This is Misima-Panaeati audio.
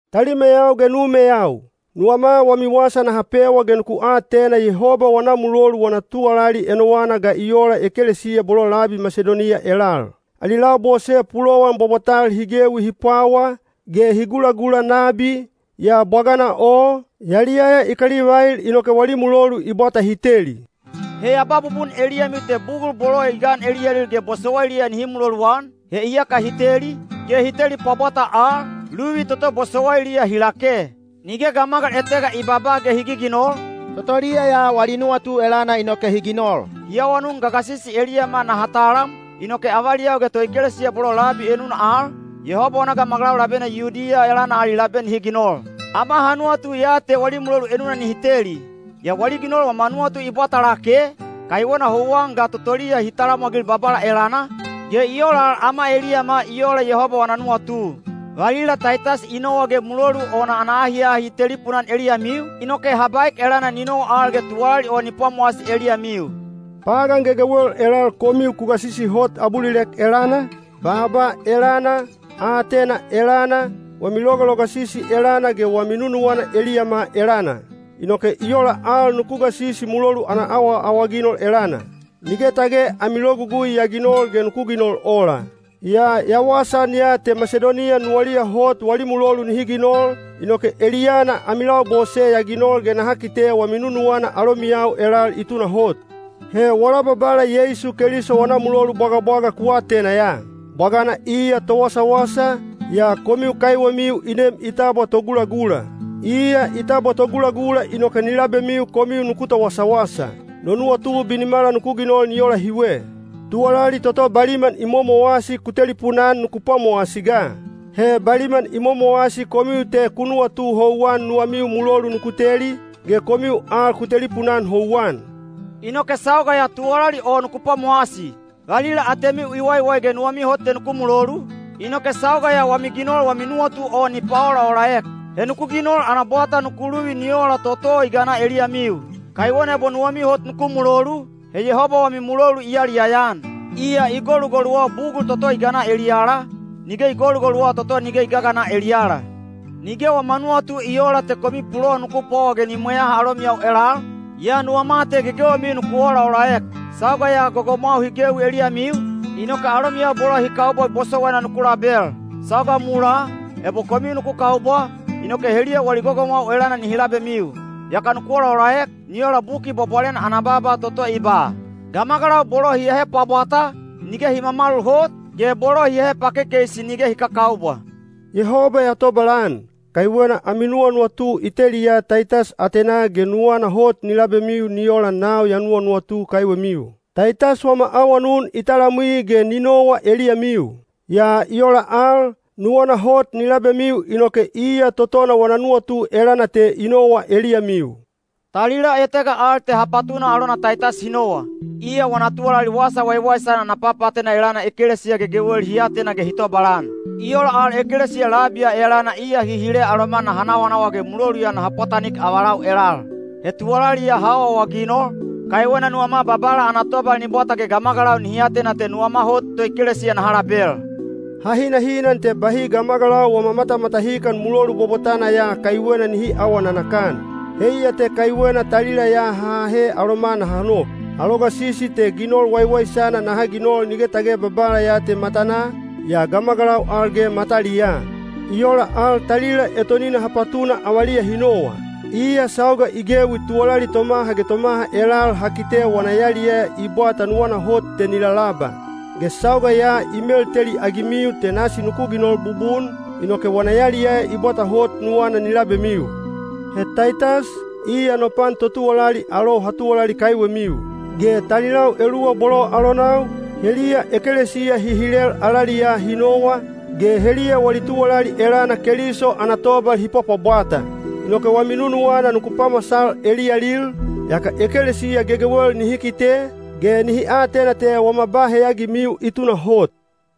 Talimeyau ge numeyau, nuwama wami wasa naha pewa ge nuku atena Yehoba wana mulolu wana tuwalali enowana ga i ola ekelesiya bolo labi Masidoniya elal. Ali labose pulowan bwabwatal hi gewi hi pwawa, ge hi gulagula nabi, yaa bwagana o, yaliyaya i kalivail inoke wali mulolu i bwata hi teli. He ya ba bubun eliyamiu te bugul bolo i gan eliyalil ge bosowailiya nihi muloluan, he iyaka hi teli, ge hi teli pwabwata al, luvi toto bosowailiya hi lake. Nige gamagal etega i babaa ge hi giginol, totoliya ya wali nuwatu elana inoke hi ginol. Hi awanun gagasisi eliyama naha talam, inoke avaliyau ge toekelesiya bolo labi enuna al, Yehoba wana gamagalau labena Yudiya elana ali labe nihi ginol. Ama ha nuwatu ya te wali mulolu enuna nihi teli. Yaa wali ginol wama nuwatu i bwata lake, kaiwena houwan ga totoliya hi talamwagil Babala elana, ge i ola al ama eliyama i ola Yehoba wana nuwatu. Valila Taitas i nowa ge mulolu o ana ahiahi i telipuna-an eliyamiu, inoke ha baek elana ni nowa al ge tuwalali o ni pwamowasi eliyamiu. Pagan gegewel elal komiu ku gasisi hot—abulilek elana, baaba elana, aatena elana, wami logalogasisi elana ge wami nunuwana eliyama elana. Inoke i ola al nuku gasisi mulolu ana awaawaginol elana. Nige tage ami logugui ya ginol ge nuku ginol ola. Yaa ya wasaan ya te Masidoniya nuwaliya hot wali mulolu nihi ginol, inoke eliyana ami labose ya ginol ge naha kite wami nunuwana alomiyau elal i tunahot. He wala Babala Yeisu Keliso wana mulolu bwagabwaga ku atena ya. Bwagana iya towasawasa, yaa komiu kaiwemiu i nem i tabwa togulagula. Iya i tabwa togulagula inoke ni labemiu komiu nuku towasawasa. No nuwatu binimala nuku ginol ni ola hiwe. Tuwalali toto baliman i momowasi ku telipuna-an nuku pwamowasi ga. He baliman i momowasi komiu te ku nuwatu houwan nuwamiu mulolu nuku teli, ge komiu al ku telipuna-an houwan. Inoke sauga ya tuwalali o nuku pwamowasi. Valila atemiu i waiwai ge nuwamiu hot te nuku mulolu, inoke sauga ya wami ginol wami nuwatu o ni paolaolaek. He nuku ginol ana bwata nuku luvi ni ola toto i gana eliyamiu. Kaiwena ebo nuwamiu hot nuku mulolu, he Yehoba wami mulolu i yaliyaya-an. Iya i golugoluwa bugul toto i gana eliyala, nige i golugoluwa toto nige i gagana eliyala. Nige wama nuwatu i oola te komiu pulowan nuku pwawa ge ni mweyaha alomiyau elal, yaa nuwama te gegewemiu nuku olaolaek. Sauga ya gogomwau hi gewi eliyamiu, inoke alomiyau bolo hi kaubwa bosowaina nuku label. Sauga mulaa, ebo komiu nuku kaubwa, inoke heliya wali gogomwau elana nihi labemiu. Yaka nuku olaolaek, ni ola Buki Bwabwalena ana baaba toto i ba, “Gamagalau bolo hi ahe pwabwata, nige hi mamalul hot, ge bolo hi ahe pakekeisi nige hi kakaubwa.” Yehoba ya tobalan, kaiwena ami nuwanuwatu i teliya Taitas atenaa ge nuwana hot ni labemiu ni ola nau ya nuwanuwatu kaiwemiu. Taitas wama awanun i talamwi ge ni nowa eliyamiu. Yaa i ola al, nuwana hot ni labemiu inoke iya totona wana nuwatu elana te i nowa eliyamiu. Talila etega al te ha patuna alona Taitas hi nowa. Iya wana tuwalali Wasa Waiwaisana ana papaatena elana ekelesiya gegewel hi atena ge hi tobalan. I ola al ekelesiya labi ya elana iya hi hile aloma naha nawanawa ge mulolu ya naha pwatanik avalau elal. He tuwalali ya ha awaawaginol, kaiwena nuwama Babala ana tobal ni bwata ge gamagalau nihi atena te nuwama hot toekelesiya naha label. Ha hinahinan te bahi gamagalau wama matamatahikan mulolu bwabwatana ya kaiwena nihi aawa nanakan. Heiya te kaiwena talila ya ha ahe aloma naha nok. Ha logasisi te ginol waiwaisana naha ginol nige tage Babala ya te matanaa, yaa gamagalau al ge mataliyaa. I ola al talila etonina ha patuna avaliya hi nowa. Iya sauga i gewi tuwalali tomaha ge tomaha elal ha kite wana yaliyaya i bwata nuwana hot te ni lalaba. Ge sauga ya i melteliagimiu te nasi nuku ginol bubun, inoke wana yaliyaya i bwata hot nuwana ni labemiu. He Taitas, iya no pan totuwalali alou ha tuwalali kaiwemiu. Ge talilau eluwa bolo alonau, heliya ekelesiya hi hilel alaliyaa hi nowa, ge heliya wali tuwalali elana Keliso ana tobal hi pwapwabwata. Inoke wami nunuwana nuku pamasal eliyalil, yaka ekelesiya gegewel nihi kite, ge nihi atena te wama ba heyagimiu i tunahot.